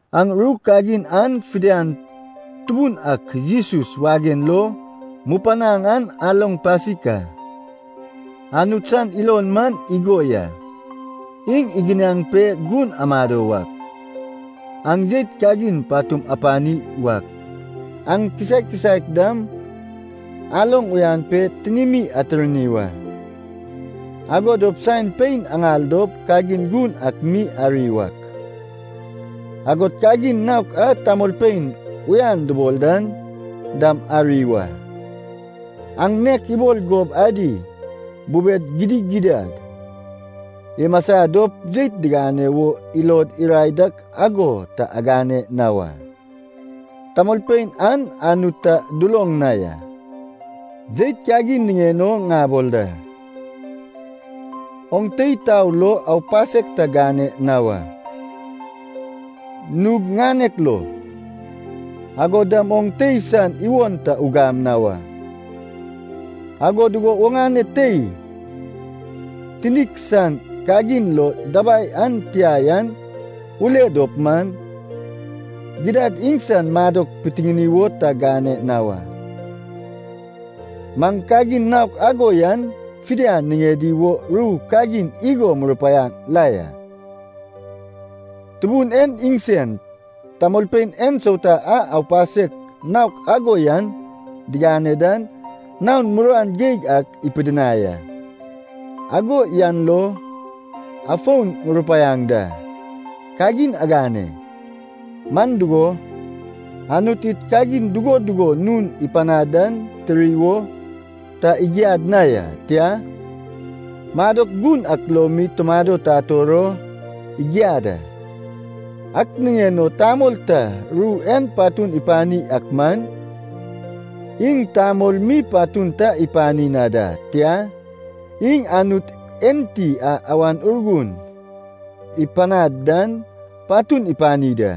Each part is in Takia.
Aŋ ru kagin an fidian Tubun ak Jesus wagen lo mupanaŋ an aloŋ pasik a. Anut san ilon man igo ya, iŋ iginiaŋ pe gun amado wak, aŋ jeit kagin patum apani wak, aŋ kisaek kisaek dam aloŋ uyan pe tinimi atirni wa. Ago dop saen pein aŋal dop kagin gun ak mi ari wak, agod kagin naok a tamolpein uyan dubol dan dam ari wa. Aŋ nek ibol gob adi bubed gidigidad imasa dop jeit digane wo ilod irae dak ago ta agane na wa. Tamolpein an Anut ta duloŋ na ya. Jeit kagin niŋen o ŋabol da, oŋ tei tao lo aupasek ta gane na wa. Nug ŋanek lo, agod dam oŋ tei san iwon ta ugam na wa. Ago dugo oŋane tei tinik san kagin lo dabai an tia yan ule dop man, gidad iŋsan madok pitiŋini wo ta gane na wa. Maŋ kagin naok ago yan fidian niŋedi wo ru kagin igo murupaiaŋ la ya, Tubun en iŋsen tamolpein ensauta a aupasek naok ago yan digane dan naon muruan geig ak ipidinai a. Ago yan lo afon murupaiaŋ da, kagin agane. Man dugo, Anut id kagin dugo dugo nun ipanad dan tiri wo ta igiad na ya, tia, madok gun ak lo mi tumado tator o igiad a. Ak niŋen o tamol ta ru en patun ipani ak man, iŋ tamol mi patun ta ipani na da. Tia, iŋ Anut enti a Awan Urgun ipanaŋ dan patun ipani da.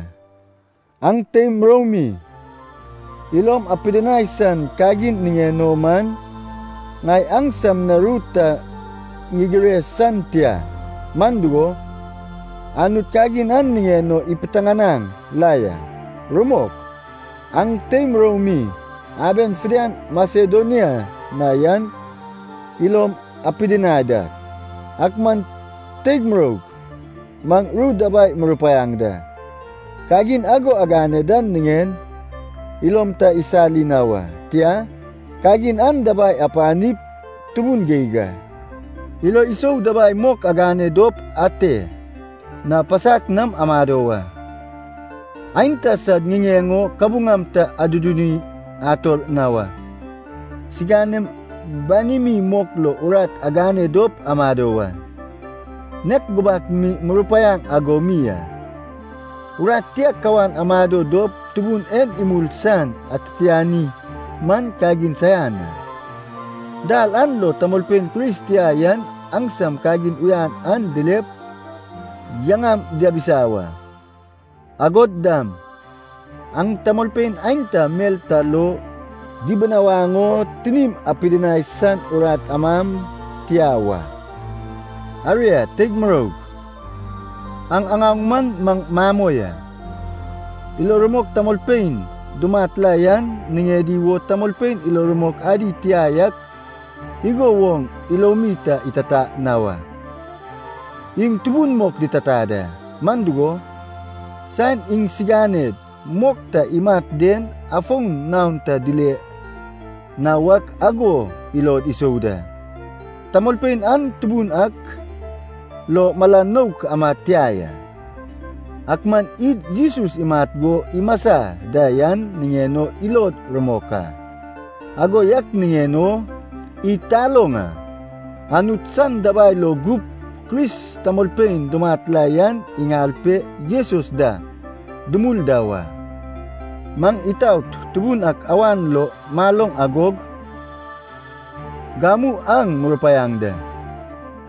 Aŋ teim muroumi ilom apidinai san kagin niŋen o man, ŋai aŋsam na ru ta ŋigire san tia, man dugo, Anut kagin an niŋen o ipiteŋanaŋ la ya. Rumok, aŋ teim muroumi aben fidian Masedonia na yan ilom apidinai da. Ak man teig muroug, maŋ ru dabai murupaiaŋ da, kagin ago agane dan niŋen ilom ta isali na wa, tia, kagin an dabai apanip tubun geig a. Ilo isou dabai mok agane dop ate na pasak nam amado wa. Aenta sad ŋiŋeŋ o kabuŋam ta aduduni ator na wa. Siŋanem banimi mok lo urat agane dop amado wa, nek gubak mi murupaiaŋ ago mi a. Urat tia kawan amado dop Tubun en imul san atitiani man kagin saian a. Dal an lo tamolpein Kris tia yan aŋsam kagin uyan an dilep yaŋam diabisa wa. Agod dam, aŋ tamolpein aenta mel ta lo dibinawaŋ o tinim apidinai san urat amam tia wa. Aria teig muroug, aŋ aŋaoŋ man maŋ mamoi a. Ilo rumok tamolpein dumat la yan, niŋedi wo tamolpein ilo rumok ad tia yak igo woŋ ilomi ta itata na wa. Iŋ tubun mok ditata da, man dugo, saen iŋsiganed mok ta imat den afon naon ta dile na wak ago ilod isou da. Tamolpein an Tubun ak lo mala nouk amad tia ya. Ak man id Jesus imat go imasa da yan niŋen o ilod rumok a, ago yak niŋen o id taloŋ a, Anut san dabai lo gup Kris tamolpein dumat la yan iŋal pe Jesus da dumul da wa. Maŋ itaot Tubun ak awan lo maloŋ agog gamu aŋ murupaiaŋ da.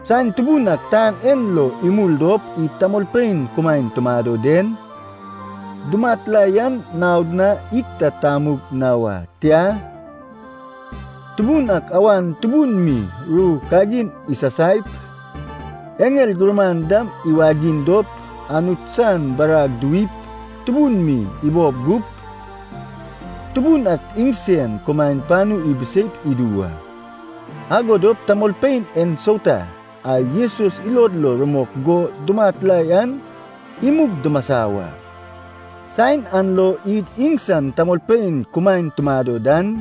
Saen Tubun ak tan en lo imul dop id tamolpein kumaen tumado den, dumat la yan naod na id ta tamug na wa. Tia, Tubun ak awan tubun mi ru kagin isasaip, eŋel gurman dam iwagiŋ dop, Anut san barag diwip tubun mi ibob gup, Tubun ak iŋsen kumaen panu ibiseip idu wa. Ago dop tamolpein ensauta a Jesus lo ilod rumok go dumat la yan imug dimasa wa. Saen an lo id iŋsan tamolpein kumaen tumado dan,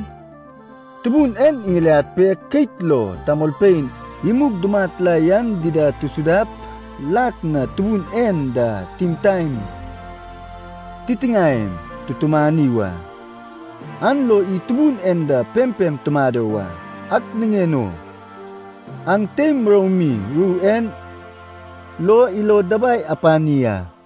Tubun en iŋiliad pe keit lo tamolpein imug dumat la yan dida tusudap, lak na Tubun en da timtaen titiŋaem tutumani wa. An lo id Tubun en da pempem tumado wa. Ak niŋen o aŋ teim muroumi ru en lo ilod dabai apani a.